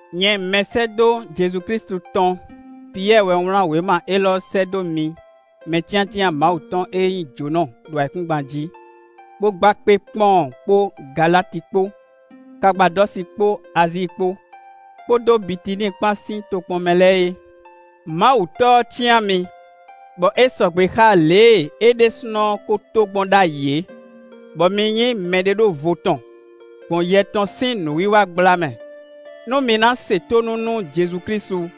Nyɛ mɛsɛ́dó Jezu Klísu tɔn Piyɛ́ɛ wɛ wlán wěma élɔ́ sɛ́ dó mi mɛcyáncyán Mawu tɔn e nyí jǒnɔ ɖo ayǐkúngban jí, bó gba kpé Pɔ́ɔn kpó Galati kpó, Kapadɔ́si kpó Azíi kpó, kpódó Bitiníi kpán sín tokpɔn mɛ lɛ́ɛ é. Mawu Tɔ́ ɔ́ cyán mi, bɔ é sɔgbe xá lě e é ɖésúnɔ ko to gbɔn ɖ'ayǐ é, bɔ mi nyí mɛɖeɖóvo tɔn, gbɔn Yɛ tɔn sín nǔwiwa gbla mɛ, nú mi ná se tónú nú Jezu Klísu,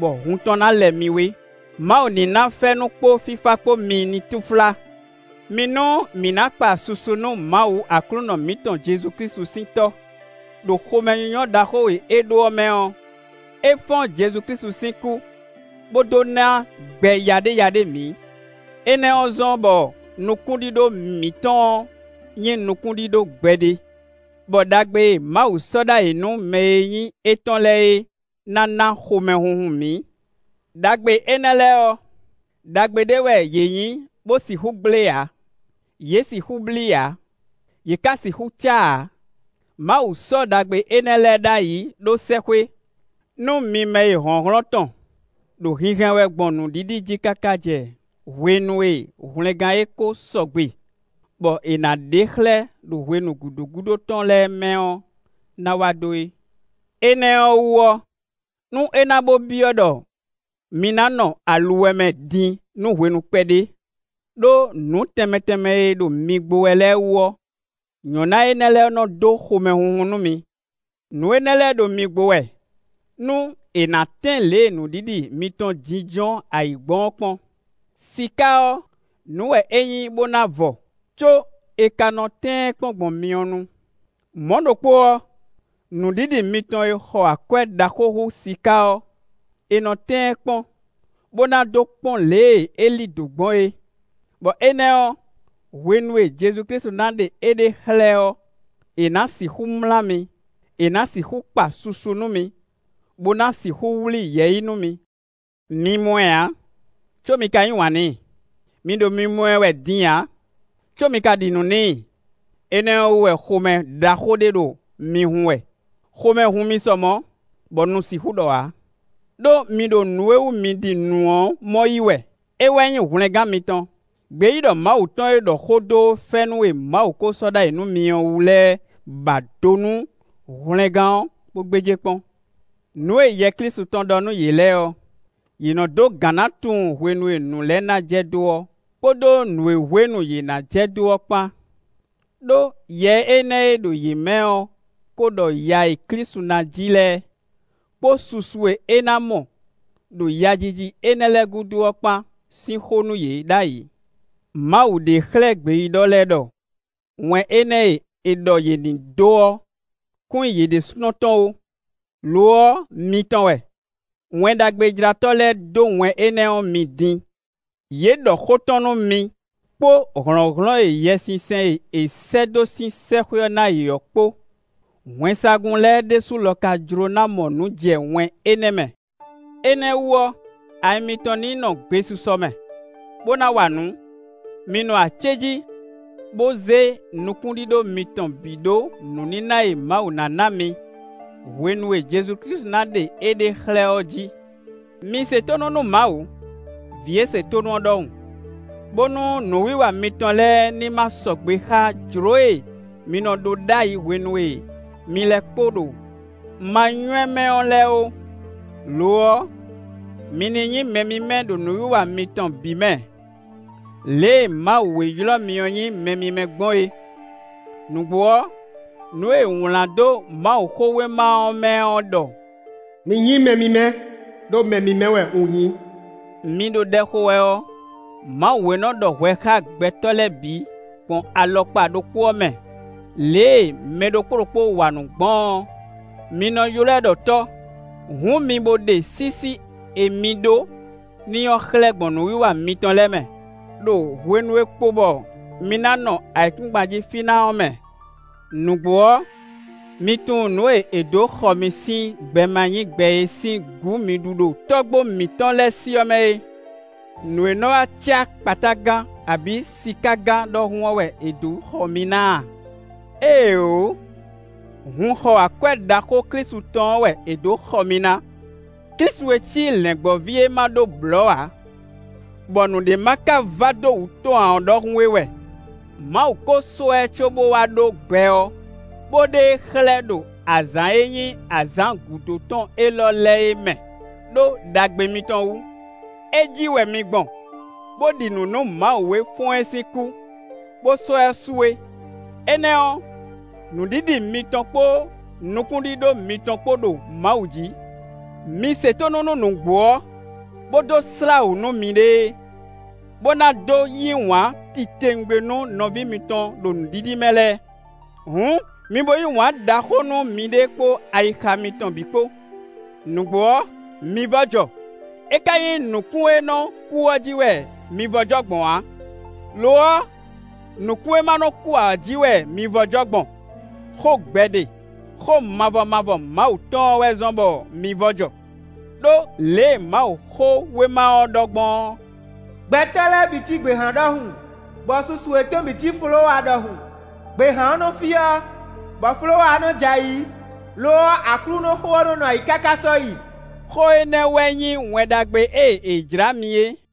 bɔ hun tɔn ná lɛ mi wé. Mawu ní ná fɛ́nú kpó fífá kpó mi ní túnflá. Mi nú mǐ ná kpa susu nú Mawu Aklúnɔ mǐtɔn Jezu Klísu sín Tɔ́. Đo xomɛnyínyɔ́ ɖaxó e é ɖó ɔ́ mɛ ɔ́, é fɔ́n Jezu Klísu sín kú, bó dó ná gbɛ yaɖéyaɖé mǐ. Énɛ́ ɔ́ zɔ́n bɔ nukúnɖíɖó mǐtɔn ɔ́ nyí nukúnɖíɖó gbɛɖe, bɔ ɖagbe e Mawu sɔ́ ɖ'ayǐ nú mɛ e nyí étɔn lɛ́ɛ é ná ná xomɛhunhun mǐ. Đagbe énɛ́ lɛ́ɛ ɔ́, ɖagbe ɖé wɛ yě nyí bó sixú gblé ǎ; yě sixú blí ǎ; yě ka sixú cá ǎ. Mawu sɔ́ ɖagbe énɛ́ lɛ́ɛ ɖ'ayǐ ɖó sɛ́xwé, nú mi mɛ e hlɔ̌nhlɔ́n tɔn ɖo hinhɛn wɛ gbɔn nǔɖiɖi jí káká jɛ hwenu e hwlɛngán e ko sɔgbe, bɔ è nǎ ɖe xlɛ́ ɖo hwenu gǔdo gúdo tɔn lɛ́ɛ mɛ ɔ́ ná wá dó é. Énɛ́ ɔ́ wú ɔ́, nú é ná bó byɔ́ ɖɔ mi ná nɔ aluwɛ mɛ din nú hwenu kpɛɖé, ɖó nǔ tɛnmɛ tɛnmɛ e ɖo mi gbo wɛ lɛ́ɛ wú ɔ́, nyɔ̌ná énɛ́ lɛ́ɛ nɔ dó xomɛhunhun nú mi. Nǔ énɛ́ lɛ́ɛ ɖo mi gbo wɛ nú è nǎ tɛ́n lě e nǔɖiɖi mitɔn jínjɔ́n ayǐ gbɔn ɔ́ kpɔ́n. Siká ɔ́, nǔ wɛ é nyí bó ná vɔ, có è ka nɔ tɛ́n ɛ kpɔ́n gbɔn myɔ nu; mɔ̌ ɖokpó ɔ́, nǔɖiɖi mitɔn e xɔ akwɛ́ ɖaxó hú siká ɔ́, è nɔ tɛ́n ɛ kpɔ́n, bó ná dó kpɔ́n lě e é lí dǒ gbɔn é. Bɔ énɛ́ ɔ́, hwenu e Jezu Klísu ná ɖe éɖée xlɛ́ ɔ́, è nǎ sixú mlá mi; è nǎ sixú kpa susu nú mi, bó ná sixú wlí yɛ̌yi nú mi. Mi mɔ ɛ ǎ, có mi ka yí wǎn n'i; mi ɖo mimɔ ɛ wɛ din ǎ, có mi ka ɖi nǔ n'i; énɛ́ ɔ́ wú wɛ xomɛ ɖaxó ɖé ɖo mi hun wɛ; xomɛ hun mi sɔ mɔ̌, bɔ nu sixú ɖɔ ǎ. Đó mi ɖo nǔ e wú mi ɖi nǔ ɔ́ mɔ yí wɛ: é wɛ nyí hwlɛngán mitɔn. Gbeyíɖɔ Mawu tɔn e ɖɔ xó dó fɛ́nú e Mawu ko sɔ́ ɖ'ayǐ nú mi ɔ́ wú lɛ́ɛ ba do nú hwlɛngán ɔ́, bó gbéjé kpɔ́n. Nǔ e Yɛ Klísu tɔn ɖɔ nú yě lɛ́ɛ ɔ́, yě nɔ dó gǎn ná tunwun hwenu e nǔ lɛ́ɛ ná jɛ dó ɔ́ kpódó nǔ e hwenu yě ná jɛ dó ɔ́ kpán; ɖó Yɛ énɛ́ e ɖo yě mɛ ɔ́ ko ɖɔ ya e Klísu ná ji lɛ́ɛ, kpó susu e é ná mɔ ɖo yajiji énɛ́ lɛ́ɛ gúdo ɔ́ kpán sín xó nú yě ɖ'ayǐ. Mawu ɖe xlɛ́ gbeyíɖɔ lɛ́ɛ ɖɔ wɛn énɛ́ e è ɖɔ yě ní dó ɔ́ kún nyí yě ɖésúnɔ tɔn ó; lo ɔ́, mi tɔn wɛ. Wɛn Ɖagbejlátɔ́ lɛ́ɛ dó wɛn énɛ́ ɔ́ mi din; yě ɖɔ xó tɔn nú mi kpó hlɔ̌nhlɔ́n e Yɛsinsɛn e è sɛ́ dó sín sɛ́xwé ɔ́ ná yě ɔ́ kpó; wɛnsagun lɛ́ɛ ɖésú lɔ ka jló ná mɔ nǔ jɛ wɛn énɛ́ mɛ. Énɛ́ ɔ́ wú ɔ́, ayi mitɔn ní nɔ gbesisɔ mɛ, bó ná wa nǔ. Mi nɔ acéjí, bó zé nukúnɖíɖó mitɔn bǐ ɖó nǔníná e Mawu ná ná mi hwenu e Jezu Klísu ná ɖe éɖée xlɛ́ ɔ́ jí. Mi se tónú nú Mawu, vǐ e se tónú ɔ́ ɖɔhun, bónú nǔwiwa mitɔn lɛ́ɛ ní ma sɔgbe xá jlǒ e mi nɔ ɖó ɖ'ayǐ hwenu e mi lɛ́ kpo ɖo manywɛ́ mɛ ɔ́ lɛ́ɛ ó. Lo ɔ́, mi ní nyí mɛ mímɛ́ ɖo nǔwiwa mitɔn bǐ mɛ, lě e Mawu e ylɔ́ mi ɔ́ nyí mɛ mímɛ́ gbɔn é. Nǔgbó ɔ́, nǔ e è wlán dó Mawuxówéma ɔ́ mɛ ɔ́ ɖɔ: “Mi nyí mɛ mímɛ́, ɖó mɛ mímɛ́ wɛ un nyí.” Mi ɖo ɖɛ xo wɛ ɔ́, Mawu e nɔ ɖɔ hwɛ xá gbɛtɔ́ lɛ́ɛ bǐ gbɔn alɔkpa ɖokpó ɔ́ mɛ, lě e mɛ ɖokpó ɖokpó wa nǔ gbɔn ɔ́, mi nɔ ylɔ́ ɛ ɖɔ Tɔ́, hǔn mi bo ɖe sísí e mi ɖó n'i ɔ́ xlɛ́ gbɔn nǔwiwa mitɔn lɛ́ɛ mɛ, ɖo hwenu e kpo bɔ mi ná nɔ ayǐkúngban jí fí ná ɔ́ mɛ. Nǔgbó ɔ́, mi tunwun nǔ e è dǒ xɔ mi sín gbɛ ma nyí gbɛ e sín gǔ mi ɖu ɖo tɔ́gbó mǐtɔn lɛ́ɛ sí ɔ́ mɛ é; nǔ e nɔ wá cá kpatágan abǐ sikágan ɖɔhun ɔ́ wɛ è dǒ xɔ mi ná a? Éeǒ! Hun xɔ akwɛ́ ɖaxó Klísu tɔn ɔ́ wɛ è dǒ xɔ mi ná; Klísu e cí lɛ̌ngbɔ́ví e ma ɖó blɔ̌ ǎ, bɔ nǔɖé ma ka va dó wútu tɔn ǎ ɔ́ ɖɔhun é wɛ. Mawu ko sɔ́ ɛ cóbó wá ɖó gbɛ ɔ́, bó ɖe e xlɛ́ ɖo azǎn e nyí azǎn gǔdo tɔn élɔ́ lɛ́ɛ é mɛ, ɖó ɖagbe mitɔn wú. É jí wɛ mi gbɔn bó ɖi nǔ nú Mawu e fɔ́n ɛ sín kú, bó sɔ́ ɛ su é; énɛ́ ɔ́, nǔɖiɖi mitɔn kpó nukúnɖíɖó mitɔn kpó ɖo Mawu jǐ. Mi se tónú nú nǔgbó ɔ́, bó dó slá wǔ nú miɖée, bó ná dó yí wǎn titewungbe nú nɔví mitɔn ɖo nǔɖiɖi mɛ lɛ́ɛ. Hǔn, mi bo yí wǎn ɖaxó nú miɖée kpó ayixa mitɔn bǐ kpó. Nǔgbó ɔ́, mi vɔ́ jɔ; é ka nyí nǔkún e nɔ kú ɔ́ jí wɛ mi vɔ́ jɔ gbɔn ǎ; lo ɔ́, nǔkún e ma nɔ kú ǎ ɔ́ jí wɛ mi vɔ́ jɔ gbɔn; xó gbɛɖe, xó mavɔ mavɔ Mawu tɔn ɔ́ wɛ zɔ́n bɔ mi vɔ́ jɔ. Đó lě e Mawuxówéma ɔ́ ɖɔ gbɔn ɔ́: “Gbɛtɔ́ lɛ́ɛ bǐ cí gběhan ɖɔhun, bɔ susu yětɔn bǐ cí folówa ɖɔhun; gběhan ɔ́ nɔ fyɔ́, bɔ folówa ɔ́ nɔ j'ayǐ; lo ɔ́, Aklúnɔxó ɔ́ nɔ́ nɔ ayǐ káká sɔ́yi.” Xó énɛ́ wɛ nyí Wɛn Ɖagbe e è jlǎ mi é.